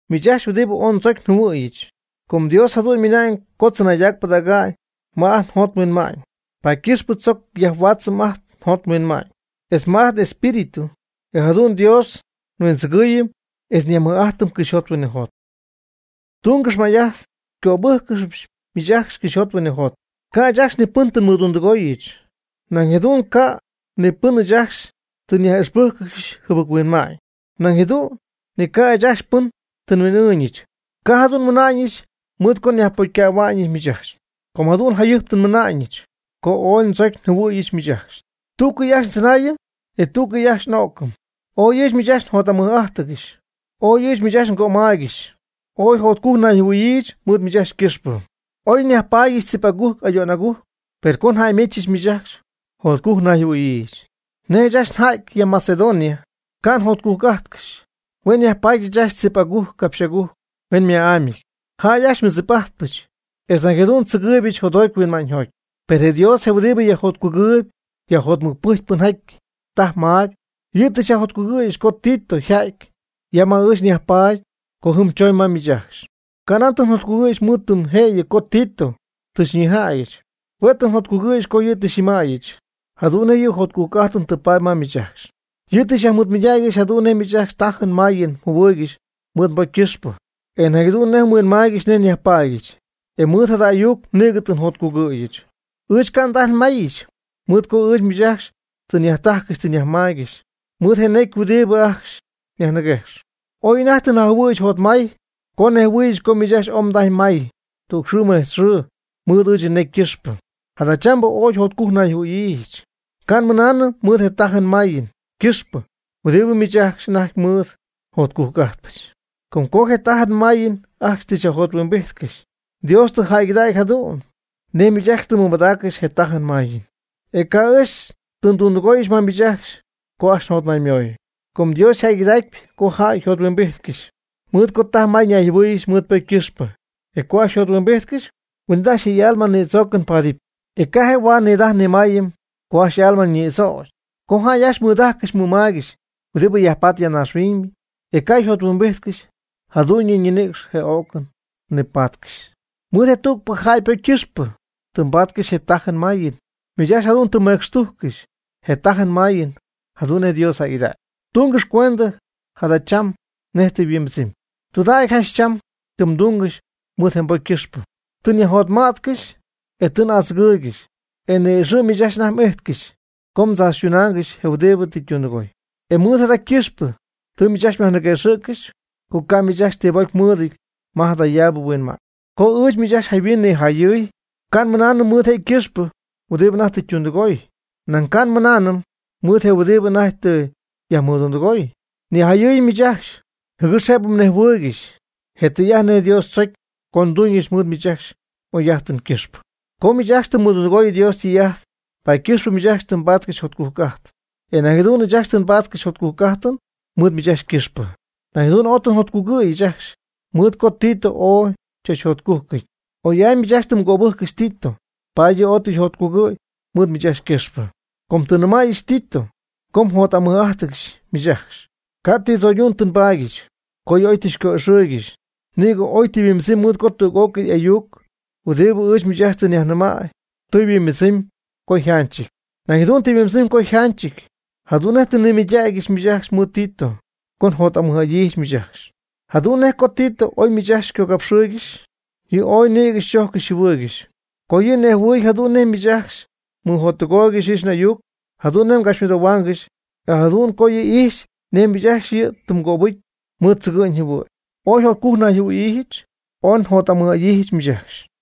Miich ajcxy huɨdibɨ ooy ndzocy njɨhuɨ̈yɨch, com Dios jadu'n ymɨna'ñ co tzɨnaydac pɨdäga'ñ ma ajt njot nhuinma'ñ, paady ycɨxp tzoc yajhuaatzɨm ajt njot nhuinma'ñ, etz ma ajt n'espíritu, e jadu'n Dios nhuindzɨgɨɨyɨm etz nyajmɨj'ajtɨm cɨxyjot huinɨjot. Tungɨx may'ajt xycöbɨgɨpɨch miich ajcxy cɨxyjot huinɨjot. Ca' ɨɨch ajcxy ni pɨn tɨ nmɨdundɨgóoygɨxyɨch, nañ jadu'n ca' ni pɨn ɨɨch ajcxy tɨ nyaj'ixpɨ́jccɨxyɨch jɨbɨc-huinma'ñ. Nañ jadu'n ni ca' ɨɨch ajcxy pɨn tɨ nhuin'ɨɨñɨch. Ca' jadu'n nmɨna'ñɨch mɨɨd co nyajpocycähua'ñɨch miich ajcxy. Com jadu'n jacjayɨjp tɨ mɨna'ñɨch co ooy ndzocy njɨhuɨ̈yɨch miich ajcxy, tú'cɨy ajcxy ndzɨnaayɨm, e tú'cɨy ajcxy n'ó'cɨmɨpy. Ooy ɨɨch miich ajcxy njot'amɨj'adyiijɨch. Ooy ɨɨch miich ajcxy ngömaaygɨxy. Ooy jotcujc nayjɨhuɨ̈yiijɨch mɨɨd miich ajcxy ycɨxpɨ. Oy njayajpaadyɨch tzip agujc ayo'n agujc, per co njäymechɨch miich ajcxy, jotcujc nayjɨhuɨ̈yiijɨch. Nej ɨɨch ajcxy nja'ty ya Macedonia, ca' njotcujc'ájtcɨxyɨch. Hue' nyajpaadyɨch ajcxy tzip agujc capxy agujc huen ma'ámyɨty. Jäy ajcxy xymɨdzip'ajtpɨch, etz nañ jadu'n tzɨgɨɨybɨch jotjoty huinma'ñyjoty. Per Dios je huɨdibɨ yajjotcugɨɨyb yajjotmɨcpɨjcp pɨnjaty tajp mayb, yɨ' tɨ xyajjotcugɨ̈yɨch co Tito yja'ty ya ma ɨɨch nyajpaady co jɨm choñ ma miich ajcxy. Ca' nan tɨ njotcugɨ̈yɨch mɨɨd tɨm jëyɨ co Tito tɨ xyñijädyɨch. Hue' tɨ njotcugɨ̈yɨch co yɨ' tɨ xyñɨmäyɨch jadu'n nej yɨ' jotcujc'ajtɨn tɨ paady ma miich ajcxy. Yɨ' tɨ xyajmɨɨdmɨydägyɨch jadu'n nej miich ajcxy tajɨn mayɨn mjɨhuɨɨygɨxy mɨɨd mbocy ycɨxpɨ. E nañ jadu'n nej mhuinmaaygɨxy nej nyajpaadyɨch. E mɨɨd jada ayuc nïgɨ tɨ njotcugɨ̈yɨch. Ɨɨch ca' ndajy nmayich mɨɨd co ɨɨch miich ajcxy tɨ nyajtajcɨxy tɨ nyajmaygɨxy mɨɨd je necy huɨdibɨ ajcxy nyajniguejx. Oy anajty tɨ njajɨhuɨ̈yɨch jotmay co nnejhuɨ̈yɨch co miich ajcxy ooy mdajy may tüg xɨɨ mejtz xɨɨ mɨɨd ɨɨch nnecy ycɨxpɨ. Jadachambɨ ooy jotcujc nayjɨhuɨ̈yiijɨch. Ca' nmɨnaanɨm mɨɨd je tajɨn je mayɨn ycɨxpɨ huɨdibɨ miich ajcxy anajty mɨɨd jotcujc'ajtpɨch, com co je tajɨn je mayɨn ajcxy tɨ xyajjothuimbijtcɨxy, Dios tɨ jäygɨdägy jadu'n nej miich ajcxy tɨ mmɨmadaaccɨxy je tajɨn mayɨn. E ca' ɨɨch tɨ ndundɨgooyɨch ma miich ajcxy co ajcxy njotmaymoy. Com Dios yjäygɨdacpyɨ co jäy njothuimbijtcɨxy, mɨɨd co taj may ñayjɨhuɨ́ɨyɨgɨxy mɨɨd ypocy ycɨxpɨ. E co ajcxy yjothuimbijtcɨxy, huin'it ajcxy je y'alma nïdzoocɨn paadɨpy. E ca' je' huaad nidajɨm nimaayɨm co ajcxy y'alma ñïdzögy. Co jäy ajcxy nidajcɨxy nimaaygɨxy huɨdi yajpat ya naaxhuiñ, e ca' yjothuimbijtcɨxy, jadu'ñɨ nɨcxy je o'cɨn nipatcɨxy. Mɨɨd je tügpɨ jäy ypocy ycɨxpɨ tɨ mbaatcɨxy je tajɨn mayɨn. Miich ajcxy jadu'n tɨ mmecxtujccɨxy je tajɨn mayɨn jadu'n nej Dios jäygɨdägy. Tungɨx cuendɨ jada' cham nej tɨ yhuimbɨdzɨmy. Tɨydudägy janch cham tɨ mdɨydungɨxy mɨɨd je pocy ycɨxpɨ. Tɨ xyajjotma'tcɨxy, e tɨ xy'adzɨgɨɨygɨxy, e ni'ixɨ̈y miich anajty m'ijtcɨxy co mdzaachytunaangɨxy je huɨdi tɨ ytundɨgooy. E mɨɨd jada ycɨxpɨ tɨ miich ajcxy myajniguëxɨ̈ccɨxy, co ca' miich ajcxy ti pocy mmɨɨdɨty ma jadayaabɨ huinma'ñ. Co ɨɨch miich ajcxy jayhuin nijayɨy, ca' nmɨnaanɨm mɨɨd je' ycɨxpɨ huɨdibɨ anajty tɨ ytundɨgooy. Nañ ca' nmɨnaanɨm mɨɨd je huɨdibɨ anajty tɨ yajmɨdundɨgooy. Nijayɨɨyɨch miich ajcxy, jɨgɨx jëbɨ mnejhuɨɨygɨxy je tɨy'ajt nej Dios tzocy co nduuñɨch mɨɨd miich ajcxy m'oy'ajtɨn ycɨxpɨ. Com miich ajcxy tɨ mmɨjottɨgooyb Dios ytɨy'ajt, paady ycɨxpɨ miich ajcxy tɨ mbaatcɨxy jotcujc'ajt, e nañ jadu'n ɨɨch ajcxy tɨ nbáatcɨxyɨch jotcujc'ajt mɨɨd miich ajcxy ycɨxpɨ. Nañ jadu'n ooy tɨ njotcugɨ̈yɨch ajcxy mɨɨd co Tito ooy chachjotcujcɨty. Oy'amy miich ajcxy tɨ mgöbɨjccɨxy Tito, paady yɨ' ooy tɨ yjotcugɨ̈y mɨɨd miich ajcxy ycɨxpɨ. Co tɨ nnɨmäyɨch Tito co njot'amɨj'adyiijɨch miich ajcxy, ca' ti tzo'ydu'n tɨ nbaadyɨch, co yɨ' oy tɨ xyco'ixɨɨygɨxy. Nïgɨ oy tɨ yhuimbɨdzɨmy mɨɨd co tüg'ócɨy ayuc huɨdibɨ ɨɨch miich ajcxy tɨ nyajnɨmäy tɨ yhuimbɨdzɨmy co yjanchɨty. Nañ jadu'n tɨ yhuimbɨdzɨmy co yjanchɨty jadu'n nej tɨ nnimɨydacyɨch miich ajcxy mɨɨd Tito co njot'amɨj'adyiijɨch miich ajcxy. Jadu'n nej co Tito oy miich ajcxy xycogapxɨ̈y, yɨ' ooy nïgɨ xychojccɨxy xyjɨhuɨɨygɨxy co yɨ' nejhuɨ̈y jadu'n nej miich ajcxy mmɨjottɨgooygɨxy ɨɨch n'ayuc, jadu'n nej mgapxymɨdoohuaangɨxy. E nañ jadu'n co yɨ' ijxy nej miich ajcxy yɨ' mgöbɨjcy mɨɨd tzɨgɨ'ñ jɨhuɨ̈'ñ. Ooy jotcujc nayjɨhuɨ̈yiijɨch, ooy njot'amɨj'adyiijɨch miich ajcxy.